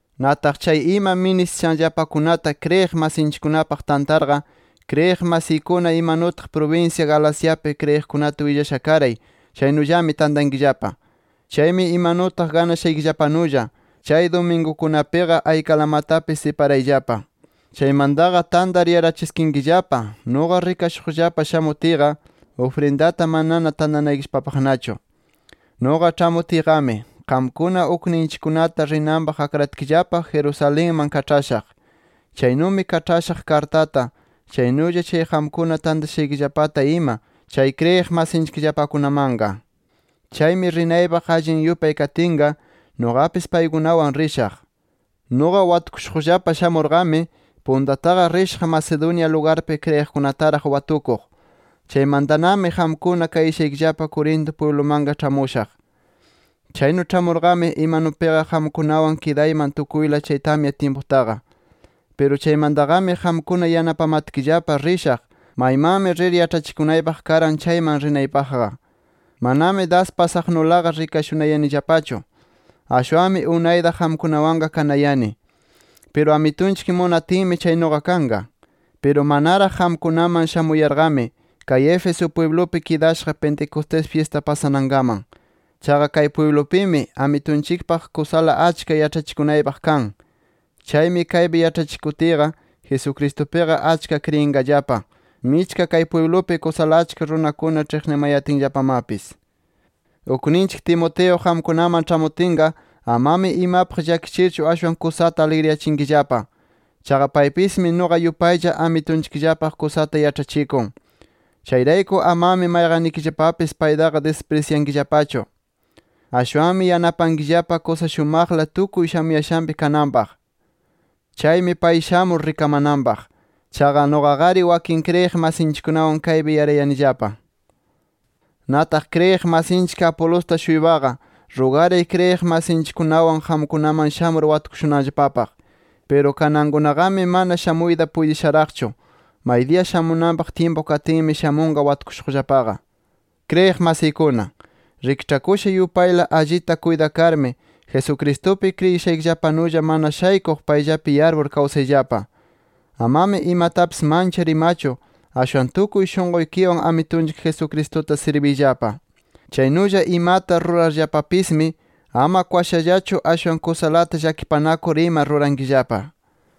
Nataq chay ima ministishanllapakunata kriyiq masinchikkunapaq tantarqa, kriyiq masiykuna imanutaq prubinsya Galaciapi kriyiqkunata willasha karay, chaynullami tantankillapa. Chaymi imanutaq ganashaykillapanulla, chay dumingukunapiqa aykalamatapis siparayllapa. Chaymantaqa tantar yarachiskinkillapa, nuqa rikashuqllapa shamutiyqa, ufrindata manana tantanaykillapapaqnachu. Nuqa ĉhamutiyqami, qamkuna ukninchikkunata rinanpaq akratkillapa Jerusalenman kaĉhashaq. Chaynumi kaĉhashaq kartata, chaynulla chay qamkuna tantashaykillapata ima chay kriyiq masinchikllapakunamanqa. Chaymi rinaypaq allin yupay katinqa, nuqapis paykunawan rishaq. Nuqa watukushuqllapa shamurqami puntataqa rishaq Macedonia lugarpi kriyiqkunataraq watukuq. Chaymantanami qamkuna kayashaykillapa Corinto pwiblumanqa ĉhamushaq. Chaynu ĉhamurqami, imanupiqa qamkunawan kidayman tukuyla chay tamya tyimputaqa. Piru chaymantaqami qamkuna yanapamatkillapa rishaq, maymanmi rir yaĉhachikunaypaq karan chayman rinaypaqqa. Manami das pasaqnulaqa rikashunayanillapachu. Ashwanmi unayta qamkunawanqa kanayani. Piru Amitunchik munatinmi chaynuqa kanqa. Piru manaraq qamkunaman shamuyarqami, kay Éfeso pwiblupi kidashaq Pentecostés fyista pasanankaman. Chaqa kay pwiblupimi, Amitunchikpaq kusala achka yaĉhachikunaypaq kan. Chaymi kaypi yaĉhachikutiyqa, Jesucristupiqa achka kriyinqallapa, michka kay pwiblupi kusala achka runakuna ĉhiqnimayatinllapamapis. Ukninchik Timoteo qamkunaman ĉhamutinqa, amami imapaq llakichirchu, ashwan kusata aligriyachinkillapa. Chaqa paypismi nuqa yupaylla Amitunchikllapaq kusata yaĉhachikun. Chayrayku amami mayqannikillapapis paytaqa disprisyankillapachu. Ashwanmi yanapankillapa kusa shumaqla tukuy shamuyashanpi kananpaq. Chaymi pay shamur rikamananpaq. Chaqa nuqaqari wakin kriyiq masinchikkunawan kaypi yarayanillapa. Nataq kriyiq masinchik Apolosta-shuypaqa, rugaray kriyiq masinchikkunawan qamkunaman shamur watukushunanllapapaq. Piru kanankunaqami, mana shamuyta puytisharaqchu. Maydiya shamunanpaq tyimpun katinmi, shamunqa watukushuqllapaqa. Kriyiq masiykuna, rikĉhakusha yupayla allita kuytakarmi, Jesucristupi kriyishaykillapanulla mana shaykuq payllapi yarpur kawsayllapa. Amami imatapis manchar imachu, ashwan tukuy shunquykiwan Amitunchik Jesucristuta sirbiyllapa. Chaynulla imata rurarllapapismi, ama kwashallachu, ashwan kusalata llakipanakur ima rurankillapa.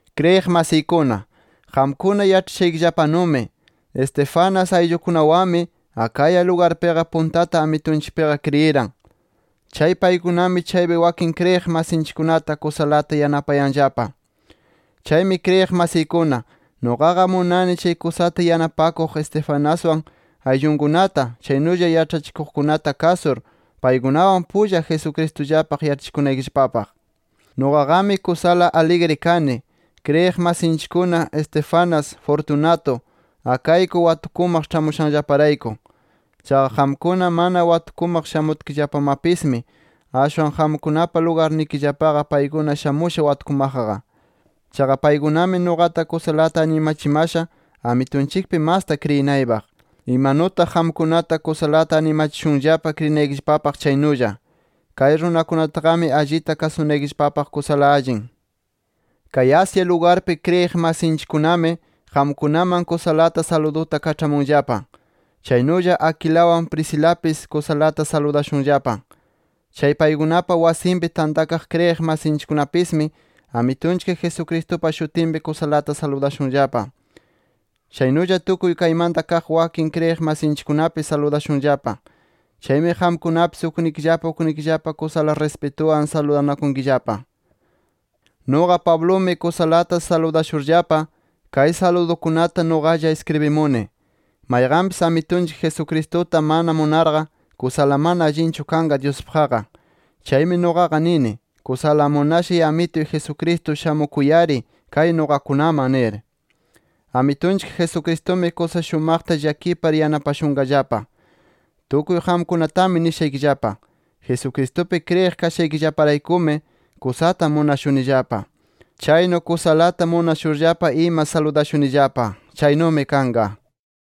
Kriyiq masiykuna, qamkuna yaĉhashaykillapanumi Estéfanas ayllunkunawanmi Acaya lugarpiqa puntata Amitunchikpiqa kriyiran. Chay paykunami chaypi wakin kriyiq masinkunata kusalata yanapayanllapa. Chaymi kriyiq masiykuna, nuqaqa munani chay kusata yanapakuq Estefanaswan ayllunkunata, chaynulla yaĉhachikuqkunata kasur, paykunawan pulla Jesucristullapaq yaĉhachikunaykillapapaq. Nuqaqami kusala aligri kani, kriyiq masinchikkuna Estéfanas, Fortunato, Acaico watukumaq ĉhamushanllaparayku. Chaqa qamkuna mana watukumaq shamutkillapamapismi, ashwan qamkunapa lugarnikillapaqa, paykuna shamusha watukumaqqa. Chaqa paykunami nuqata kusalata animachimasha Amitunchikpi masta kriyinaypaq, imanutaq qamkunata kusalata animachishunllapa kriyinaykillapapaq chaynulla. Kay runakunataqami, allita kasunaykillapapaq kusala allin. Kay Asia lugarpi, kriyiq masinchikkunami qamkunaman kusalata saluduta kaĉhamunllapa. Chaynulla Aquilawan, Priscilapis kusalata saludashunllapa. Chay paykunapa wasinpi tantakaq kriyiq masinchikkunapismi, Amitunchik Jesucristupa shutinpi kusalata saludashunllapa. Chaynulla tukuy kaymanta kaq wakin kriyiq masinchikkunapis saludashunllapa. Chaymi qamkunapis uknikillapa uknikillapa kusala rispituwan saludanakunkillapa. Nuqa Pablumi kusalata saludashurllapa, kay saludukunata nuqalla iskribimuni. Mayqanpis Amitunchik Jesucristuta mana munarqa, kusala mana allinchu kanqa Dyuspaqqa. Chaymi nuqaqa nini: ¡Kusala munashay Amituy Jesucristo shamukuy-ari kay nuqakunaman! nir. Amitunchik Jesucristumi kusa shumaqta llakipar yanapashunqallapa. Tukuy qamkunatami nishaykillapa: Jesucristupi kriyiq kashaykillaparaykumi kusata munashunillapa. Chaynu kusalata munashurllapa ima saludashunillapa. Chaynumi kanqa.